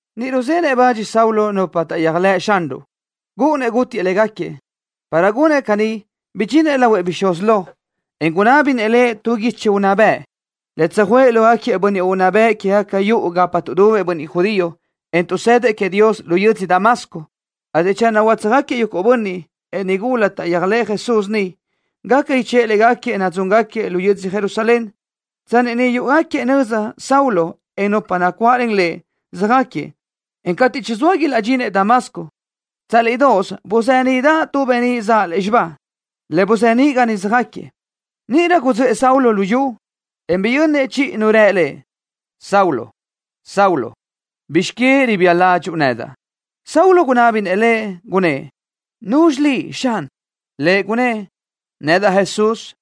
Niʼ ruzenëʼ bach Saulo nupa taʼyéajlëʼ Xanruʼ, gúʼunnëʼ gútiëʼ légaquiëʼ. Para gunëʼ caní bidxinëʼ lahuëʼ bixúz lo, en gunábinëʼ lëʼ tu guichi unná bëʼ, le tsöjuʼë lógaquiëʼ bönniʼ unná bëʼ quégaca yuʼu gapa tuʼdubëʼ bönniʼ judío, en tuʼsëdëʼ queëʼ Dios lu yödzö Damasco, ateʼ channö utsöjxáquiëʼ yuguʼ bönniʼ, en nigula taʼyéajlëʼë Jesús niʼ, gaca ichë́ʼë légaquiëʼ nadzúngaquiëʼ lu yödzö Jerusalén. Tsanni niʼ yúʼugaquiëʼ nöza Saulo, en nupa nacuáʼlen lëʼ, söjáquiëʼ, en cateʼ chizóa ilaʼdxinëʼ Damasco, tsálidoʼos buzeniʼdaʼ tu beníʼ zaʼ lúzxiba, le buzeníʼ ga niʼ söjáquiëʼ. Níʼirö gudzöʼë Saulo lu yu, en biyönnëʼ chiʼi Nu rë lëʼ: —Saulo, Saulo, ¿bizx que ribía ládxuʼu nedaʼ? Saulo gunábinëʼ Lëʼ, gunnë́ʼ: —¿Nuzxi liʼ, Xan? Lëʼ gunnë́ʼ: —Nedaʼ Jesús,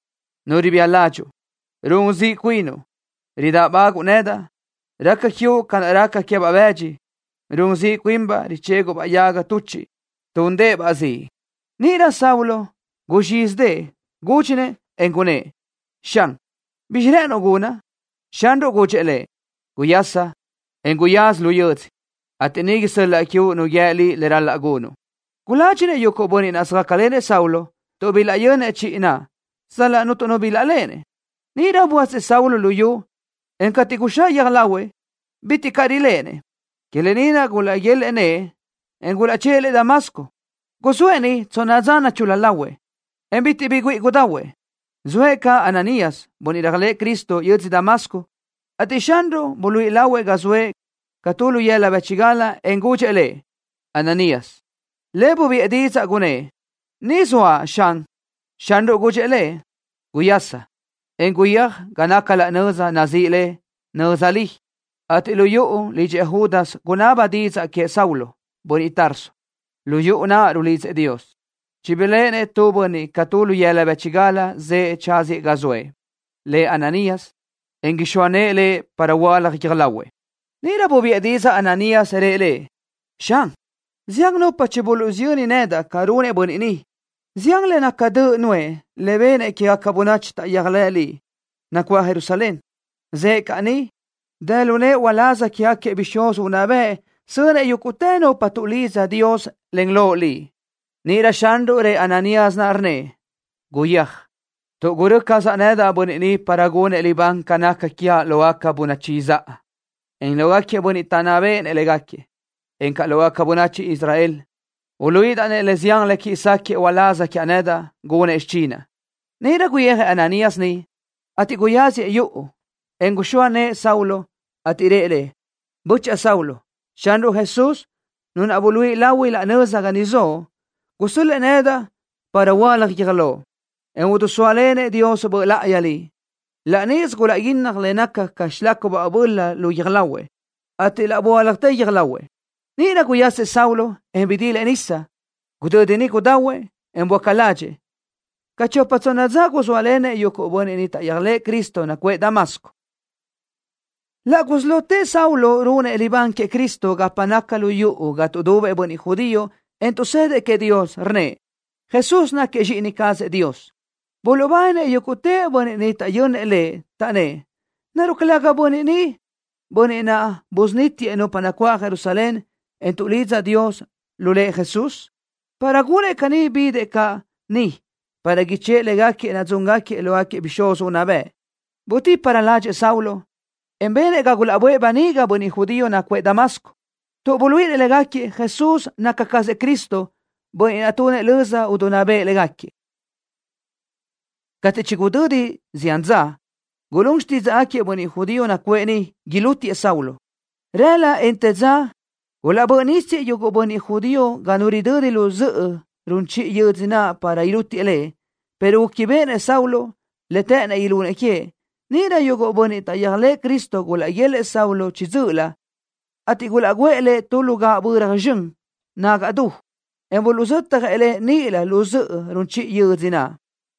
Nu ribía ládxuʼu. Run ziʼ cuinuʼ, ridáʼbaguʼu nedaʼ. Raca quiuʼ ca naʼ raca queë́baʼ bëdxi, run ziʼ cuinbaʼ richéguʼbaʼ yaga tuchiʼ túndëʼë-baʼ ziʼ. Níʼirö Saulo guzxízidëʼë, gúdxinëʼ, en gunnë́ʼ: —Xan, ¿bizxi rë́ʼënuʼ gunaʼ? Xanruʼ gudxëʼ lëʼ: —Guyasa, en guyáz lu yödzö, ateʼ niʼ isö́l-laʼa quiuʼ nu guíë liʼ le ral-laʼ gunuʼ. Guládxinëʼ yuguʼ bönniʼ naʼ söjácalenëʼ Saulo, tuʼ bilaʼyönnëʼ chiʼi naʼ, sal-laʼ cuntu nu bilaʼléʼenëʼ. Níʼirö böasëʼ Saulo luyú, en cateʼ guxáʼ guiö́j lahuëʼ, bitiʼ caʼ riléʼenëʼ. Que lë ni naʼ gulaʼguélëʼë nëʼë, en gulaʼchë́ʼë lëʼ Damasco. Guzóëʼ niʼ tsonna dza nachul-la lahuëʼ, en bitiʼ bi güíʼi gudahuëʼ. Zoëʼ caʼ Ananías, bönniʼ réajlëʼë Cristo, yödzö Damasco, ateʼ Xanruʼ buluíʼi lahuëʼ ga zoëʼ ca tu lu yëla bë́chigal, en gudxëʼ lëʼ: —Ananías. Lëʼ bubiʼë didzaʼ, gunnë́ʼ: —Ni zoaʼ, Xan. Xanruʼ gudxëʼ lëʼ: —Guyasa, en guyéaj ga naca laʼ nöza naʼ nazíʼi le Nöza Li, ateʼ lu yuʼu lidxëʼ Judas gunaba didzaʼ queëʼ Saulo, bönniʼ Tarso. Lu yuʼu naʼ rulidzëʼ Dios. Chibiléʼenëʼ tu bönniʼ ca tu lu yëla bë́chigal zëʼë tsáziëʼ ga zoëʼ, lëʼ Ananías, en ixóa nëʼë lëʼ para huöálaj guiö́j lahuëʼ. Níʼirö bubiʼë didzaʼ Ananías, rëʼ Lëʼ: —Xan, zián nupa chibuluʼsiyö́nnëʼ nedaʼ ca runëʼ bönniʼ ni, zián le naca döʼ nuʼë le benëʼ quégaca bönachi taʼyéajlëʼ Liʼ, nacuáʼ Jerusalén. Zëʼë caʼ ni, dë lu nëʼë uláz quégaquiëʼ bixúz unná bëʼ sönëʼ yúguʼtë nupa tuʼlidza Dios len Loʼ Liʼ. Níʼirö Xanruʼ rëʼ Ananías naʼ, rnnëʼ: —Guyéaj, tuʼ gurö́ cazaʼ nedaʼ bönniʼ ni para gunëʼ libán ca naca quiaʼ lógaca bönachi izáʼa, en lógaquiëʼ bönniʼ taʼnná béʼenëʼ légaquiëʼ, encaʼ lógaca bönachi Israel. Uluíʼidaʼ lëʼ le zián le quiʼi sáquëʼë uláz quiaʼ nedaʼ, gunëʼ xichinaʼ. Níʼirö guyijëʼ Ananías niʼ, ateʼ guyáziëʼ yuʼu, en guxóa nëʼë Saulo, ateʼ rëʼ lëʼ: —Böchaʼa Saulo, Xanruʼ Jesús, Nu naʼ buluíʼi lahui laʼ nöza ga niʼ zoʼo, gusö́l-lëʼë nedaʼ para huöálaj guiö́j loʼ, en idisóalenëʼ Dios Böʼ Láʼayi liʼ. Laʼ níʼisö gulaʼguínnaj le naca ca xilácubaʼ böla lu guiö́j lahuëʼ, ateʼ laʼ böáljatë guiö́j lahuëʼ. Níʼirö guyasëʼ Saulo, en bidilëʼ nisa. Gudödi niʼ gudahuëʼ, en böáca ládxëʼë. Ca chopa tsonna dza guzóalenëʼ yuguʼ bönniʼ taʼyéajlëʼë Cristo nacuʼë Damasco. Laʼ gusí lotëʼ Saulo runëʼ libán queëʼ Cristo gapa naca lu yuʼu ga tuʼdubëʼ bönniʼ judío, en tuʼsëdëʼ queëʼ Dios, rnnëʼ: —Jesús náquiëʼ Zxíʼini cazëʼ Dios. Buluʼbáninëʼ yúguʼtë bönniʼ niʼ taʼyönnëʼ lëʼ, taʼnnë́ʼ: —¿Naruʼ calëga bönniʼ ni bönniʼ naʼ busunítiëʼ nupa nacuáʼ Jerusalén, en tuʼlidza Dios lu Lëʼ Jesús? Para gunëʼ caní bidëʼ caʼ ni para ichë́ʼë légaquiëʼ nadzúngaquiëʼ lógaquiëʼ bixúz unná bëʼ. Bidíparö ládxëʼë Saulo, en benëʼ ga gulaʼböʼë böniga bönniʼ judío nacuʼë Damasco, tuʼ buluíʼinëʼ légaquiëʼ Jesús naca cazëʼ Cristo, bönniʼ naʼ tunëʼ löza idinná béʼenëʼ légaquiëʼ. Cateʼ chigudödi zián dza, gulún xtídzaʼgaquiëʼ bönniʼ judío nacuʼë niʼ ilútiëʼ Saulo. Rëla, en të dza gulaʼbö́ʼ nísiëʼ yuguʼ bönniʼ judío ga nu ridödi lu zöʼö run chiʼi yödzö naʼ para ilútiëʼ lëʼ, pero gúquibeʼenëʼ Saulo le të́ʼënnëʼ ilunëʼ queëʼ. Níʼirö yuguʼ bönniʼ taʼyéajlëʼë Cristo gulaʼguélëʼë Saulo chiʼi dzö́ʼölö, ateʼ gulaʼguʼë lëʼ tu lu gaʼböra zxön nagaʼ du, en buluʼzötjëʼ lëʼ níʼilö lu zöʼö run chiʼi yödzö naʼ.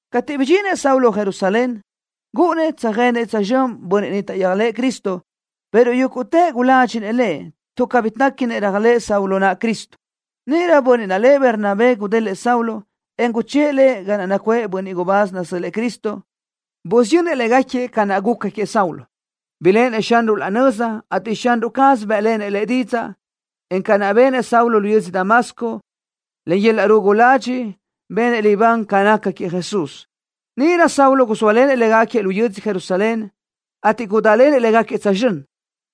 Cateʼ budxinëʼ Saulo Jerusalén, gúʼunnëʼ tsöjenëʼ tsözxö́n bönniʼ niʼ taʼyéajlëʼë Cristo, pero yúguʼtëʼ guládxinëʼ lëʼ, tuʼ cabí téquinëʼ réajlëʼë Saulo naʼ Cristo. Níʼirö bönniʼ naʼ lëʼ Bernabé gudélëʼë Saulo, en guchë́ʼë lëʼ ga naʼ nacuʼë bönniʼ gubáz nasö́l-lëʼë Cristo. Busiyönnëʼ légaquiëʼ ca naʼ guca queëʼ Saulo, biléʼenëʼ Xanruʼ laʼ nöza, ateʼ Xanruʼ caz bë́ʼlenëʼ lëʼ didzaʼ, en ca naʼ benëʼ Saulo lu yödzö Damasco, len yöl-laʼ rugu ladxiʼ benëʼ libán ca naca queëʼ Jesús. Níʼirö Saulo guzóalenëʼ légaquiëʼ lu yödzö Jerusalén, ateʼ gudálenëʼ légaquiëʼ tsözxö́n.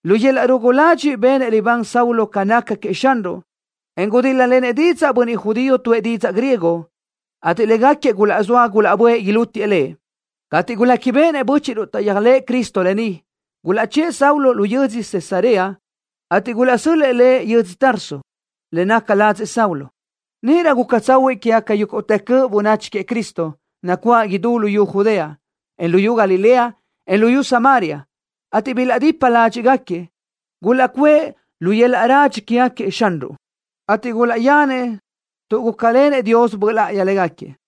Lu yöl-laʼ rugu ladxiʼ benëʼ libán Saulo ca naca queëʼ Xanruʼ, en gudíl-lalenëʼ didzaʼ bönniʼ judío tuʼë didzaʼ griego, ateʼ légaquiëʼ gulaʼzóa gulaʼböʼë ilútiëʼ lëʼ. Cateʼ guléquibeʼenëʼ bö́chiʼruʼ taʼyéajlëʼë Cristo lë ni, gulaʼchë́ʼë Saulo lu yödzö Cesarea, ateʼ gulaʼsö́l-lëʼë lëʼ yödzö Tarso, le naca ladzëʼ Saulo. Níʼirö guca tsahuiʼ quégaca yúguʼtë cöʼ bönachi queëʼ Cristo, nacuáʼ idú luyú Judea, en luyú Galilea, en luyú Samaria, ateʼ bilaʼdipa ládxiʼgaquiëʼ. Gulaʼcuʼë lu yöl-laʼ radxi quégaquiëʼ Xanruʼ, ateʼ gulaʼyanëʼ tuʼ gúcalenëʼ Dios Böʼ Láʼayi légaquiëʼ.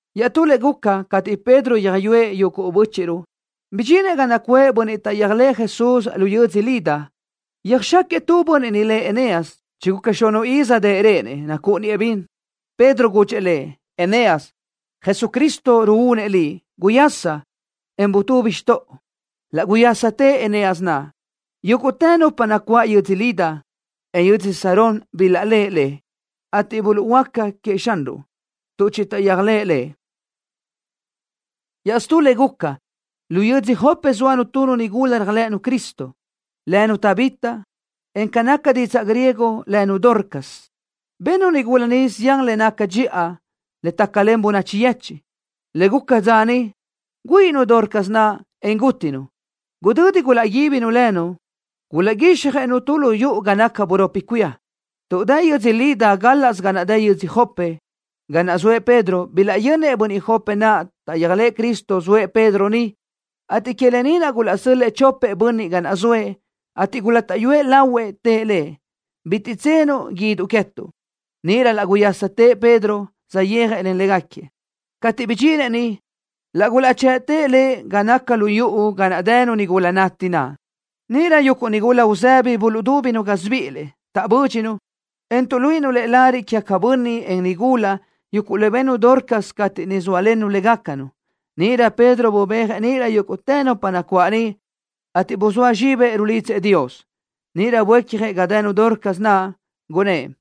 Iaʼtú le guca, cateʼ Pedro yöjyúëʼ yuguʼ bö́chiʼruʼ, bidxinëʼ ga nacuʼë bönniʼ taʼyéajlëʼë Jesús lu yödzö Lida. Yöjxáquiëʼ tu bönniʼ niʼ lëʼ Eneas, chiguca xunuʼ iz dëʼ réʼenëʼ, nacúʼuniëʼ bin. Pedro gudxëʼ lëʼ: —Eneas, Jesucristo ruúnëʼ liʼ. Guyasa, en butubi xtoʼo. Laʼ guyásatëʼ Eneas naʼ. Yúguʼtë nupa nacuáʼ yödzö Lida, en yödzö Sarón bilaʼléʼe lëʼ, ateʼ buluʼhuöáca queëʼ Xanruʼ, tuʼ chitaʼyéajlëʼ Lëʼ. Iaʼstú le guca, lu yödzö Jope zóanu tu nigula réajlëʼënu Cristo, lënu Tabita, en ca naca didzaʼ griego lënu Dorcas. Bennu nigula ni zián le nácagaca dxiʼa le tácalen bönachi yechiʼ. Le guca dza niʼ, güíʼinu Dorcas naʼ, en gútinu. Gudödi gulaʼguíbinu lënu, gulaʼguíxjëʼ-nu tu lu yuʼu ga naca buropi cuía. Tuʼ dë yödzö Lida gálaʼsö ga naʼ dë yödzö Jope, ga naʼ zoëʼ Pedro, bilaʼyönnëʼ bönniʼ Jope naʼ taʼyéajlëʼë Cristo zoëʼ Pedro niʼ, ateʼ que lë ni naʼ gulaʼsö́l-lëʼë chopëʼ bönniʼ ga naʼ zoëʼ, ateʼ gulátaʼyuëʼ lahuëʼ, tëʼ lëʼ: —Bitiʼ tsenuʼ guíduʼ queë́tuʼ. Níʼirö laʼ guyásatëʼ Pedro, saʼyéajlenëʼ légaquiëʼ. Cateʼ bidxinëʼ niʼ, laʼ gulaʼchëʼtëʼ lëʼ ga naca lu yuʼu ga dënu nigula nati naʼ. Níʼirö yuguʼ nigula uzëbi buluʼdúbinu gásibiʼilëʼ, taʼbö́dxinu, en tuʼluíʼinu lëʼ lariʼ quégaquiëʼ bönniʼ, en nigula, yuguʼ le bennu Dorcas cateʼ niʼ zóalennu légacanu. Níʼirö Pedro bubéajëʼ níʼilö yúguʼtë nupa nacuáʼ niʼ, ateʼ buzóa zxibëʼ, rulidzëʼ Dios. Níʼirö buécjëʼ ga dënu Dorcas naʼ, gunnë́ʼ: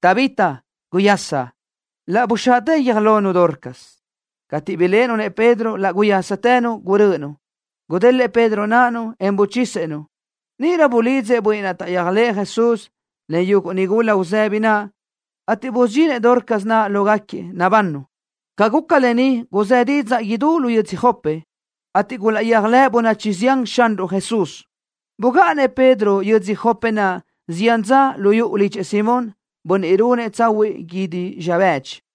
—Tabita, guyasa. Laʼ buxaʼtë guiö́j lonu Dorcas. Cateʼ biléʼenu-nëʼ Pedro, laʼ guyástënu, gurö́ʼönu. Gudélëʼë Pedro náʼanu, en buchisëʼ-nu. Níʼirö bulidzëʼ bönniʼ naʼ taʼyéajlëʼë Jesús, len yuguʼ nigula uzëbi naʼ, ateʼ busudxinëʼ Dorcas naʼ lógaquiëʼ, nabannu. Ca guca lë ni guzë́ didzaʼ idú lu yödzö Jope, ateʼ gulaʼyéajlëʼ bönachi zián Xanruʼ Jesús. Bugáʼanëʼ Pedro yödzö Jope naʼ zián dza lu yuʼu lidxëʼ Simón, bönniʼ runëʼ tsahuiʼ guídi zxa bëdxi.